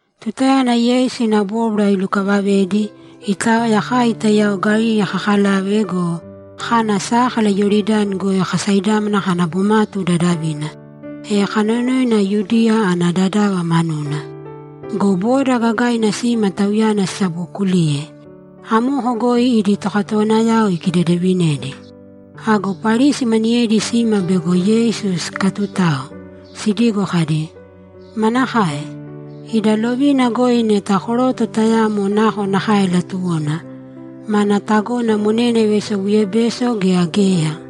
Tutayana Yeisu ina bóbwara ilukavavedi, itaoya kai taiyao Galili kakalave go, kana sákala Iyoridani goi kasaidámana kana bomatu dadavina, e kanonoina Yudiya ana dadava manuna. Go boda gagaina sima Tauyana sisabokuliye. Amoko goi idi tokatowanayao ikidedevinedi. Ago Parisi maniyedi sima bego Yeisu sikatutao, sidigo kadi, ‘Manakae? Ida lovina goi neta koroto tayamo nakonakae latuwona, mana tagona monena ivaisobuyebeso gea geya?’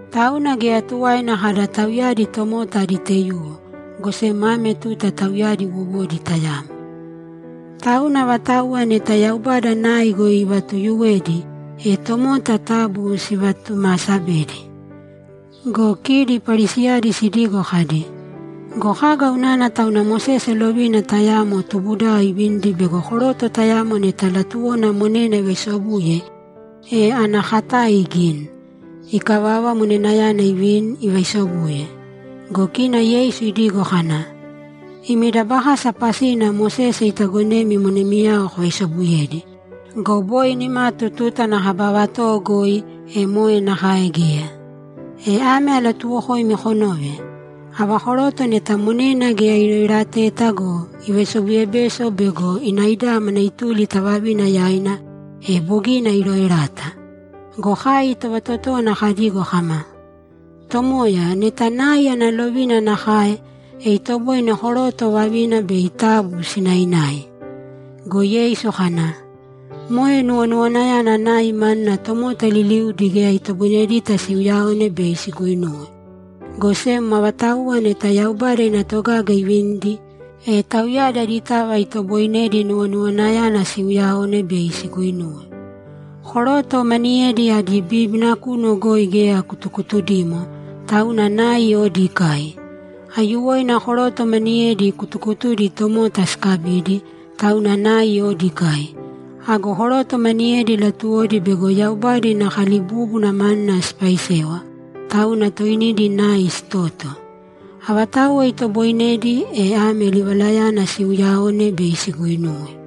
Tauna geya tuwaina kada tauyadi tomota adi taiyuwo, go sem ame tuta tauyadi wowodi tayamo. Tauna avatauwa neta Yaubada nai goi ivatuyuwedi, e tomota taabu sivatumaasabēdi.’ Go kidi Parisiyadi sidigo kadi, ‘Go kaga unana tauna Mosese lovina tayamo tubudao ivinidi bego koroto tayamo neta latuwona monena ivaisobuye, e ana katae igini. Ikavava, monenayana ivini, ivaisobuye?’ Go kina Yeisu idigo kana, ‘Imi dabakasa pasina Mosese itagonemi monemiyao kovaisobuyedi. Go boi nimatu tuta ana kaba vatowo goi, e moe nakae geya. E ame alatuuwokoimi konōve: Ava koroto neta monena geya iroerateta go, ivaisobuyebeso bego inaidámana ituli ta vavina yaina, e bogina iroerata.’ Go kai tovatotówana kadigo kama, ‘Tomoya, neta nai ana lovina nakae, e itoboine koroto vavina bei taabu sinaināi.’ Go Yeisu kana, ‘Moe nuwonuwanayana nai manuna tomota liliudi geya itoboinedita siuyaone bei siguinuwe, go sem avatauwa neta Yaubada ina togaga ivinidi, e tauyadi aditava itoboinedi nuwonuwanayana siuyaone bei siguinuwe. Koroto maniyedi adi bíbina kunu goi geya kutukutudimo, tauna nai odi ikai. Aiyuwoina koroto maniyedi kutukutudi tomota sikabidi, tauna nai odi ikai. Ago koroto maniyedi latuwodi bego Yaubada ina kalibúbuna manuna sipaisewa, tauna toinidi nai sitoto. Avatauwa itobooinedi, e ame livalayana siuyaōne bei siguinuwe.’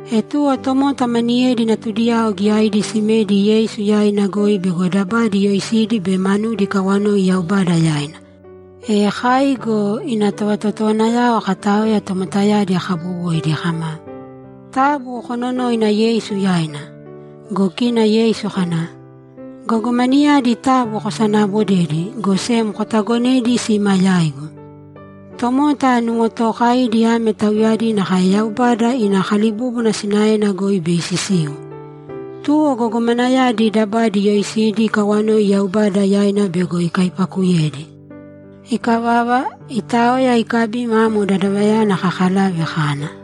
E tuwo tomota maniyedi natudiyao giyaidi simedi Yeisu yaina goi bego dabadi iyoisidi be manudi ikawanoi Yaubada yaina. E kai go ina tovatotowanayao kataoya tomotayadi kabowoidi kama, ‘Taabu kononōina Yeisu yaina.’ Go kina Yeisu kana, ‘Gogomanayadi taabu kosanaabodēdi, go sem kotagonēdi sima yaigu. Tomota nuwotookaidi ame tauyadi nakae Yaubada ina kalibúbuna sinaena goi bei sisiu.’ Tuwo gogomanayadi dabadi iyoisidi ikawanoi Yaubada yaina bego ikaipakuyedi. Ikavava, itaoya ikabima amo dadavayana kakalave kana.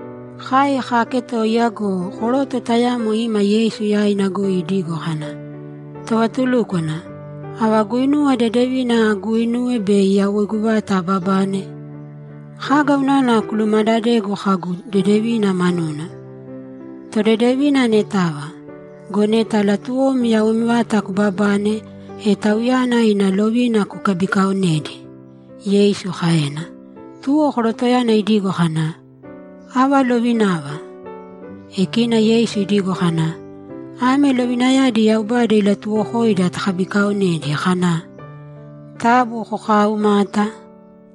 Kai kaaketoiya go, koroto tayamo ima Yeisu yaina goi idigo kana, ‘Tovatulúkwana, ava guinuwa dedevina aguuinuwe bei yawoigu vata ababane?’ ‘Kaga unana kulumadadegu kaga dedevina manuna? Todedevina anetava. Go neta latuwom yawoim vata kubabane, e Tauyana ina lovina kukabikaonēdi’, Yeisu kaena. Tuwo korotoyana idigo kana, ‘Ava lovinava?’ E kina Yeisu idigo kana, ‘Ame lovinayadi Yaubada ilatuwokoida takabikaonedi, kana, “Taabu kokaaumāta.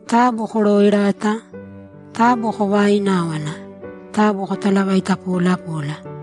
Taabu korooerāta. Taabu kovaaināwana. Taabu kotalavaita polapōla.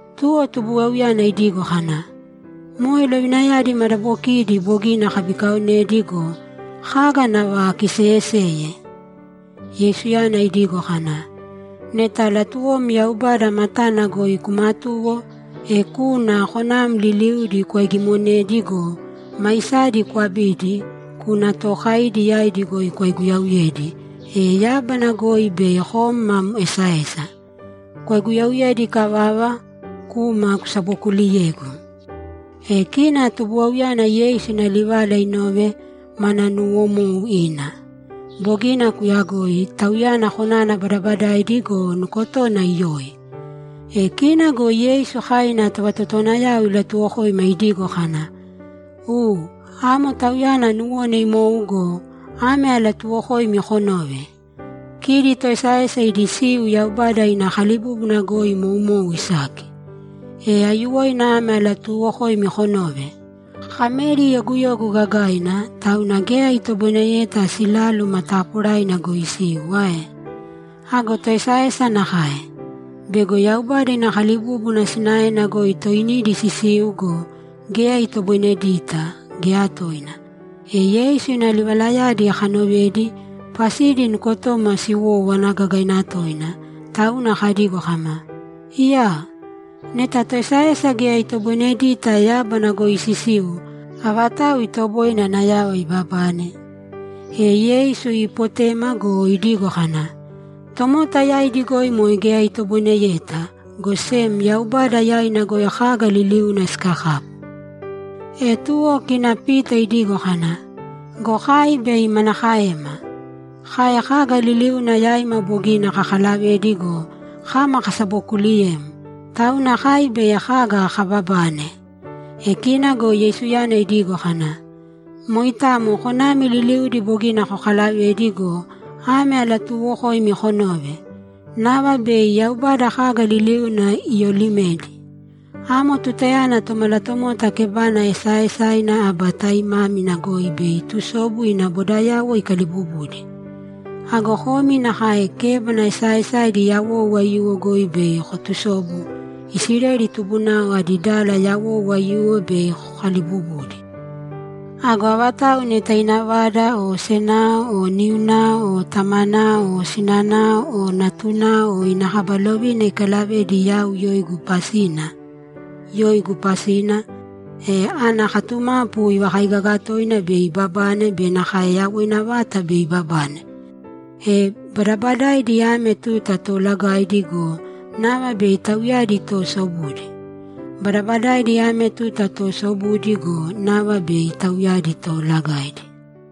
Tuwo tubuwauyana idigo kana, ‘Moe lovinayadi madabokiidi bogina akabikaaonedi go, kaga nava akiseyeseye?’ Yeisuyana idigo kana, ‘Neta latuwom Yaubada matana goi kumatuwo, e kūna konam liliudi kwaigimonēdi go, maisadi kwabīdi, kūna tookaidi yaidi goi kwaiguyauyēdi, e yábana goi bei kom mam esaesa. Kwaiguyauyedi ikavava, kūma kusabokuuliyēgu.’ E kina tubuwauyana Yeisu ina livala inove, mana nuuwomou ina. Bogina kuyagoi. Tauyana konana badabadaidi go, nukotona iyoi. E kina go Yeisu kai ina tovatotowanayao ilatuwokoima idigo kana, ‘U, amo tauyana nuwona imou go, ame alatuuwokoimi konōve: Kidi toesaesa idi siu Yaubada ina kalibúbuna goi moumou isaki. E aiyuwoina ame alatuuwokoimi konōve: Kameri yoguyogu gagaina, tauna geya itoboineyeta siláluma taporaina goi isiu ae? Ago toesaesa nakae. Bego Yaubada ina kalibúbuna sinaena goi toinidi sisiu go, geya itoboinedita, geya toina.’ E Yeisu ina livalayadi kanovedi, pasidi nukotoma siwówana gagaina toina, tauna kadigo kama, ‘Iyaa! Neta toesaesa geya itoboinedita yábana goi sisiu, avatau itoboine ana yava ibabane?’ E Yeisu iipotema go, idigo kana, ‘Tomota yaidi goi moe geya itoboineyeta, go sem Yaubada yaina goi kaga liliuna sikakapu.’ E tuwo kina Pita idigo kana, ‘Go kai bei manakaema? Kai kaga liliuna yaima bogina kakalavedi go, kama kasabokuuliyem, tauna kai bei kaga kababane?’ E kina go Yeisuyana idigo kana, ‘Moitamo konami liliudi bogina kokalavedi go, ame alatuuwokoimi konōve: Nava bei Yaubada kaga liliuna iyolimedi. Amo tutayana Tomalatomota kebana esaaesaina aba taimámina goi bei itusobu ina bodayauwo ikalibubudi. Ago komi nakae kébana esaaesaidi yawou aiyuwo goi bei kotusobu, Isileli tubunao adi dala yawou aiyuwo bei kokalibubudi. Ago avatau neta ina vada o senao o niunao o tamanao o sinanao o natunao o ina kaba lovina ikalavedi yau yoigu pasina, e ana katumapu ivakaigaga toina bei ibabane be nakae yawoina vata bei ibabane. E badabadaidi ame tuta toolagaidi go, nava bei tauyadi toosobudi. Badabadaidi ame tuta toosobudi go, nava bei tauyadi toolagaidi.’